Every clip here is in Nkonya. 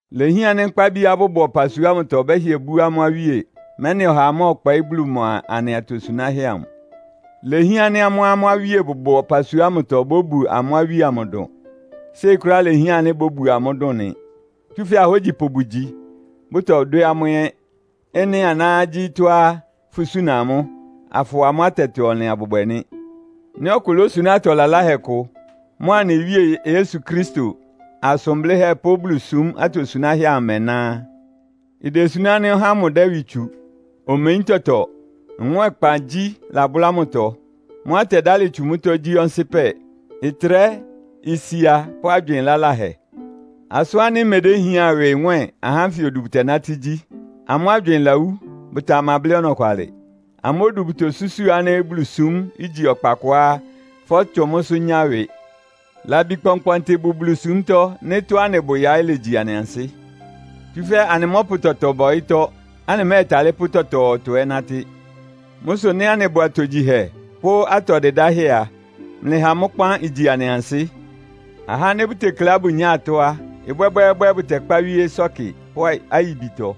Ilehián ánɩ́ nkpábiá bʋbʋ ɔpasua ámʋtɔ bɛ́hɩɛ bú amʋ́ awíe, mɛ́nɩ ɔhaa mɔ́ɔkpɔɩ́ Bulu mʋa anɩ atosunáhɛ́ amʋ. Ilehián ánɩ́ amʋ́á amʋ́ awíe bʋbʋ ɔpasua ámʋtɔ bóbu amʋ́ awíe amʋ dʋn. Séi kʋ́ráá ilehián ánɩ́ bóbu amʋ́ dʋn nɩ, tsúfɛ́ ahógyipʋ bʋgyi, bʋtɔdwɛ́ amʋ́ ɛ́. Ɩ́nɩ aná gyí tɔ́á fʋsúna amʋ́, afʋwa amʋ́ atɛtɔ-ɔnlɩn abʋbwɛ nɩ́. Nɩ́ ɔkʋ lósuná atɔ laláhɛ kʋ, mʋ́a anɩ Wíe Yesu Kristo asʋn blɩ́hɛ́ pʋ́ Bulusúm atosunáhɛ́ amʋ ɩmɛná á, idesuná ánɩ́ ɔhá ámʋ dɛ́ ɩwɩ tsu. Omeyín tɔtɔ, nwɛ́ɛnkpangyí labʋ́lá mʋtɔ. Mʋ́á ɩtɛdálɩ tsu mʋ́tɔ́ gyí ɔnsɩ́pɛ, ɩtrɛ́, isia pʋ́ agywɩɩn laláhɛ. Asʋ́n ánɩ́ imedéhián ɩwɩ nwɛ́ɛn ahá ánfɩ odu bʋtɛnátɩ́ gyí. Amʋ́ agywɩɩn lawú, bʋtamablɩ́ ɔnɔkwalɩ. Amʋ́ odu bʋtosúsu ánɩ́ Bulusúm igyi ɔkpa kʋá fɔ́tsʋn mʋ́sʋ́ nyá ɩwɩ. Labi kpɔnkpɔntɩ bʋ Bulusúmtɔ́ nɩ́ tɔ́á anɩbʋ yaɩ́ legyi anɩ ansɩ́. Tsúfɛ́ anɩmɔ́pʋ tɔtɔ ba ɔyɩ́tɔ́, anɩmɛ́ɛtalɩ́ pʋ́ tɔtɔɔtɔ ɛ́ nátɩ́. Mʋ́ sʋ nɩ́ anɩbʋ atogyihɛ pʋ́ atɔ dɩdáhɛ́ a, mlɩha mʋ́ kpán igyi anɩ ansɩ́. Ahá ánɩ́ bʋtekleá bʋnyáa atɔ́ á, ɩbwɛ́bwɛ́ɛ́bwɛ́ bʋtɛkpá wíé ɩsɔ́kɩ pʋ́ ayibitɔ.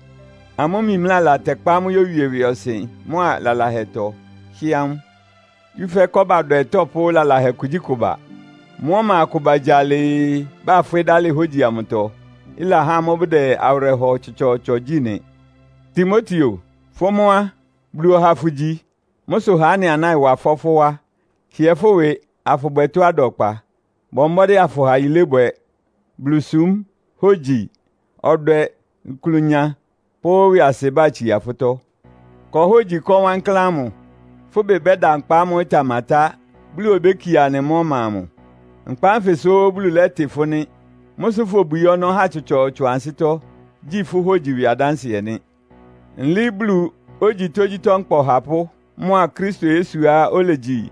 Amʋ́ mimlála tɛkpá amʋ́ yówie ɩwɩɔsɩn mʋ́a lalahɛtɔ, hɩ́ amʋ́. Tsúfɛ́ kɔ́badwɛ tɔ́pʋ́ lalahɛ kugyíkʋ ba. Mʋ́ ɔma akʋ bagya alɩɩ, bafwɩ́ dalɩ hógyi amʋtɔ, ɩlahá amʋ́ bʋdɛ awɩrɛhɔ tsɔtsɔɔtsɔ gyí nɩ. Timoteo, fʋ mʋ́ á, Bulu ɔha fʋgyi. Mʋ́ sʋ ha ɩ́nɩ aná ɩwa ɩfɔ́ fʋ́ wá. Hɩɛ fʋ́ ɩwɩ, afʋbwɛ tɔ́á ɩda ɔkpa. Bɔ mbɔ́dɩ́ afʋha yilébwɛ, Bulusúm, hógyi, ɔdwɛ, klʋnya pʋ́ ɩwɩasɩbá itsía fʋ́tɔ́. Kɔ hógyi ɩkɔ́ wankláán ámʋ. Fʋ́ ɩbɩ bɛ́da nkpa ámʋ́ʋ́ ɩtamatá, Bulu obékie anɩ mʋ́ ɔma amʋ. Nkpa ánfɩ sʋ́ Bulu lɛ́tɩ fʋ́ nɩ́. Mʋ́ sʋ fobwií ɔnɔ́ ahá tsɔtsɔɔtsɔ ansɩ́tɔ́, gyi fʋ́ hógyi ɩwɩ adánsɩɛ nɩ́. Nlɩɩ́ Bulu, ogyi tógyítɔ́ nkpa Ɔhapʋ́ mʋa Kristo Yesuá olegyi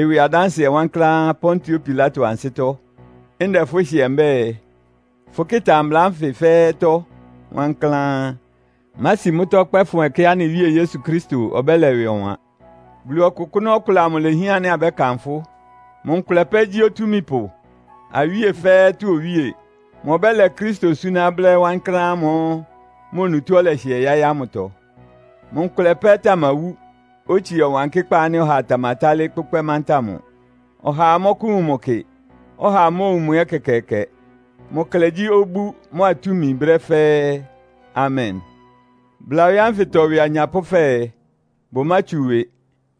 ɩwɩ adánsɩɛ wankláán Pontio Pilato ansɩ́tɔ́, ndɛ fʋ́ hɩɛ, mbɛ́ɛ, fʋkɩ́ta mbla ánfɩ fɛ́ɛ́tɔ́ wankláán. Mási mʋ́tɔ́ kpɛ́fʋn ɛkɛá anɩ Wíe Yesu Kristo ɔbɛ́lɛ ɩwɩ ɔwan. Bulu ɔkʋkʋ́nʋ́ ɔkʋlɛ amʋ ilehián ánɩ́ abɛ́kanfʋ́. Mʋ nkʋlɛ pɛ́ gyí Otúmípʋ, awíe fɛ́ɛ́tɔ́ Owíe. Mʋ ɔbɛ́lɛ Kristo súná brɛ́ wankláán ámʋ́ʋ́ mʋ onutó ɔlɛhɩɛ yáɩ́ ámʋtɔ. Mʋ nkʋlɛ pɛ́ tamawú, otsie ɔwankɩ́kpá ánɩ́ ɔhaa tamatálɩ́ kpʋ́kpɛ́ mánta mʋ. Ɔhaa mɔ́kʋ́wun mʋ kɩ, ɔhaa móowun mʋ ɛ́ ɛkɛkɛɛkɛ. Mʋ klɛ gyí obú mʋ́a túmi brɛ́ fɛ́ɛ́! Amen! Bla ɔyɩ́ ánfɩtɔ ɩwɩ anyapʋ́ fɛɛ, bʋmátsu ɩwɩ.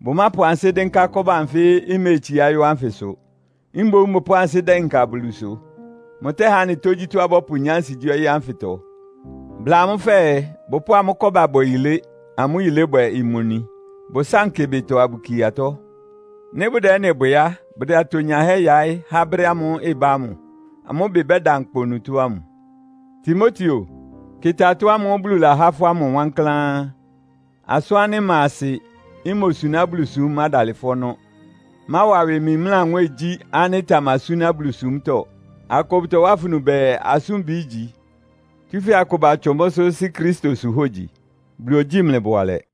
Bʋmápʋ ansɩ́ dɩ́nká kɔ́ba anfɩ́ iméetsiá yɔ́ ánfɩsʋ. Mboún bʋpʋ́ʋ ansɩ́ dɩnka Bulusʋ. Mʋtɛ́há anɩ tógyítɔ́á abɔ́pʋnyá ansigyí ɔyɩ́ ánfɩtɔ. Bla amʋ́ fɛɛ, bʋpʋ́ʋ amʋ́ kɔ́ba bwɛ yilé, amʋ́ yilébwɛ imoni. Bʋsánkɩ ɩbɩtɔ abʋkie atɔ́. Nɩ́ bʋdɛ ɩ́nɩ bwɛ á, bʋdɛ atonyahɛ́ yaɩ́ há brɛ́ ámʋ́ʋ́ ɩbá ámʋ. Amʋ́ ɩbɩ bɛ́da nkpa onutó ámʋ. Timoteo, kɩ́tá ɩtɔ́ ámʋ́ʋ́ Bulu lahá fʋ́ ámʋ wankláán. Asʋ́n ánɩ́ ɩma asɩ, imosuná Bulusúm mádalɩ fʋ́ ɔnɔ́. Máwa ɩwɩ mimlá nwɛ́ɛngyí ánɩ́ ɩtamasúná Bulusúmtɔ́. Akʋ bʋtɔwá afunu bɛɛ, asʋ́nbɩ igyi. Tsúfɛ́ akʋ batsʋn mʋ́sʋ́ sí Kristosʋ hógyi. Bulu ogyíi mlɩ bʋalɛ.